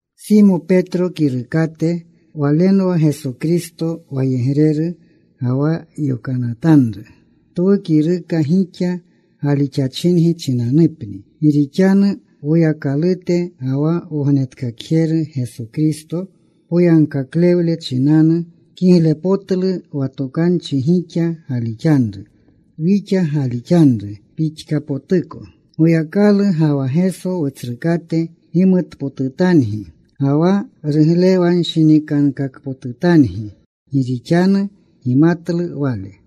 Simo Petro kirukate. Walenwa Geso Kristo wayegreru ga wa yokanatanru. Twu kiruka gixa galixachingi chinanupni, gi rixanu Woyakalute ga wa Wognetkakjeru Geso Kristo poyagkaklewle chinanu kiglepotlu wa tokanchi gixa galixanru, wixa galixanru pixkapotuko. Goyakalu ga wa Geso Wutsrukate gimutpotutangi ga wa ruglewanshinikankakpotutangi gi rixanu gimatlu Wale.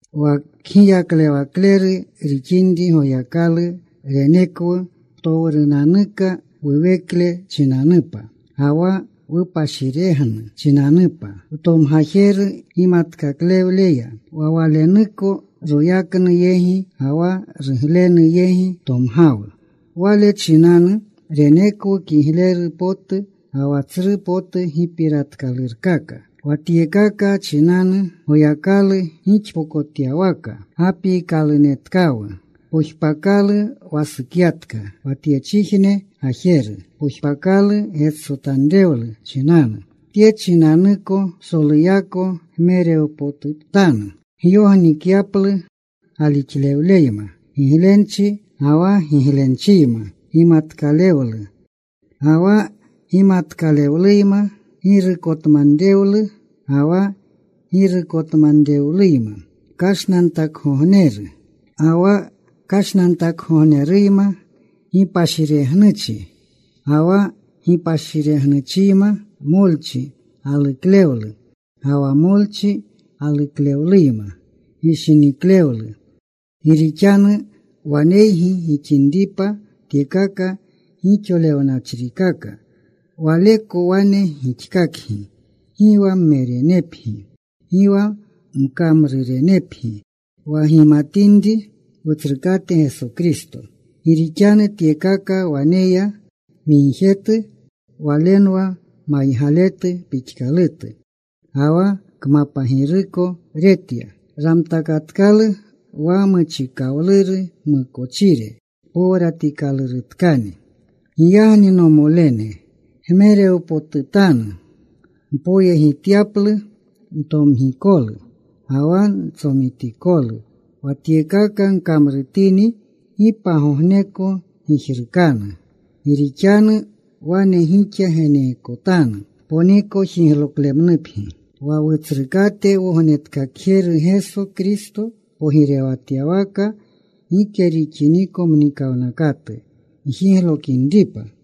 Wa Kgiyaklewakleru rixinri Goyakalu renekwu ptowrunanuka wuwekle chinanupa ga wa wupashiregnu chinanupa wtomgajeru gimatkalewleya. Wa Walenuko royaknu yegi ga wa ruglenu yegi tomgawu. Wale chinanu renekwu kigleru potu ga wa tsru potu gipiratkalurkaka. Wa tyekaka chinanu Goyakalu gixpokotyawaka gapiikalunetkawu. Pojpakalu wasukyatka, wa tyechijne gajeru pojpakalu getsotanrewlu chinanu. Tye chinanuko psoluyako gmerewpotutanu gyognikyaplu galixlewleyma giglenchi, ga wa giglenchiyma gimatkalewlu, Ga wa gimatkalewluyma girukotmanrewlu, ga wa girukotmanrewluyma, kashnantakgogneru, ga wa kashnantakgogneruyma gipashiregnuchi. Ga wa gipashiregnuchiyma molchi galuklewlu, ga wa molchi galuklewluyma gishiniklewlu. Gi rixanu waneygi gixinipa tyekaka gixolewnachrikaka, waleko wane gixkakgi gi wa mmerenepgi, gi wa mkamrurenepgi wa gimatinri Wutsrukate Geso Kristo. Gi rixanu tyekaka waneya migjetu walenwa maygaletu pixkalutu, ga wa kmapagiruko retya. Ramtakatkalu wa muchikawluru mukochire powratikalurutkani. Giyagni, nomolene, gmerewpotutanu mpoyegityaplu ntomgikolu ga wa ntsomitikolu. Wa tyekaka gkamrutini, gi pagogneko gijrukanu. Gi rixanu wane gixa geneekotanu ponikojigloklemnupgi, wa Wutsrukate Wognetkakjeru Geso Kristo pogirewatyawaka gike rixiniko mnikawnakatu gjiglokinripa.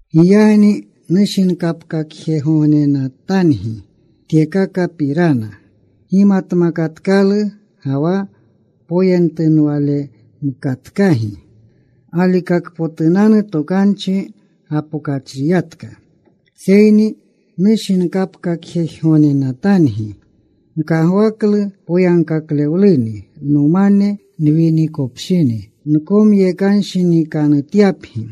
Giyagni nushinkapkakjegognenatangi tyekakapirana. Gimatmakatkalu, ga wa poyentunwalemkatkagi galikakpotunanu tokanchi gapokachriyatka, seyni nushinkapkakjegognenatangi. Nkagwaklu poyagkaklewluni, nomane nwinikopshini, nkomyekanshinikanutyapgi,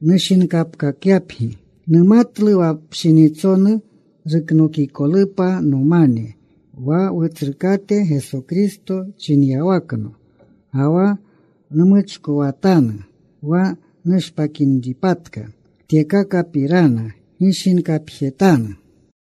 nushinkapkakyapgi. Numatlu wa pshinitsonu ruknokikolupa nomane wa Wutsrukate Geso Kristo chinyawakno. Ga wa nmuchkowatanu wa nushpakinpatka, tyekakapirana gishinkapjetanu.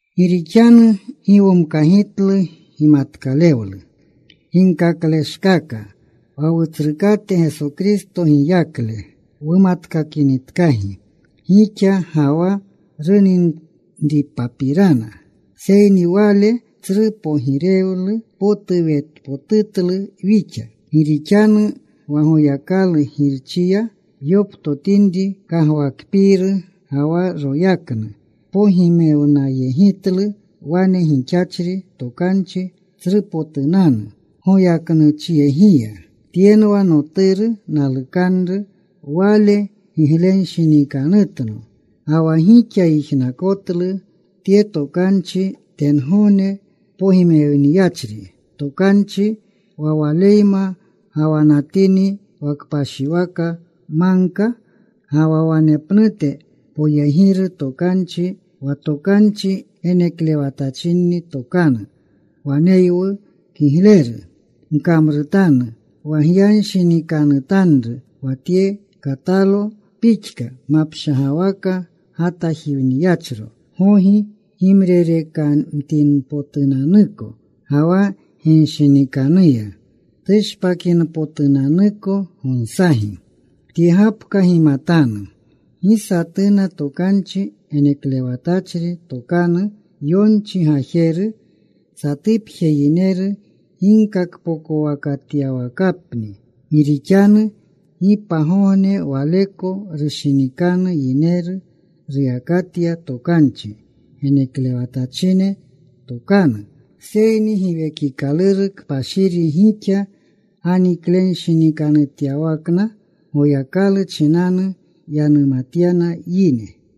Gi rixanu gi womkagitlu gimatkalewlu ginkakleshkaka wa Wutsrukate Geso Kristo giyakle wumatkakinitkagi gixa ga wa runinripapirana. Seyni Wale tsru pogirewle potu wetpotutlu wixa. Gi rixanu wa Goyakalu Girchiya yoptotinri kagwakpiiru ga wa royaknu, pogimewnayegitlu wane gixachri tokanchi tsrupotunanu goyaknuchyegiya: “Tyenwa Noturu nalukanru. Wale gigletanshinikanutno.” Ga wa wixa yijnakotlu tye tokanchi, tengogne pogimewniyachri tokanchi, wa Waleyma gawanatini wa kpashiwaka magka. Ga wa wanepnute poyegiru tokanchi, wa tokanchi geneklewatachinni tokanu, waneywu. Kigleru gkamrutanu wa gyanshinikanutanru wa tye, katalo pixka mapshagawaka gatajiwniyachro, gogi gimrerekamtinpotunanuko, ga wa ginshinikanuya tushpakinpotunanuko gonsagi. Tye gapka gimatanu. Gi satuna tokanchi geneklewatachri tokanu, yonchi gajeru, satupje yineru ginkakpokowakatyawakapni. Gi rixanu gi pagogne waleko rushinikanu yineru ruyakatya tokanchi geneklewatachine tokanu, seyni Giwekikaluru Kpashiri gixa ganiklenshinikanutyawakna, Goyakalu chinanu yanumatyana yine.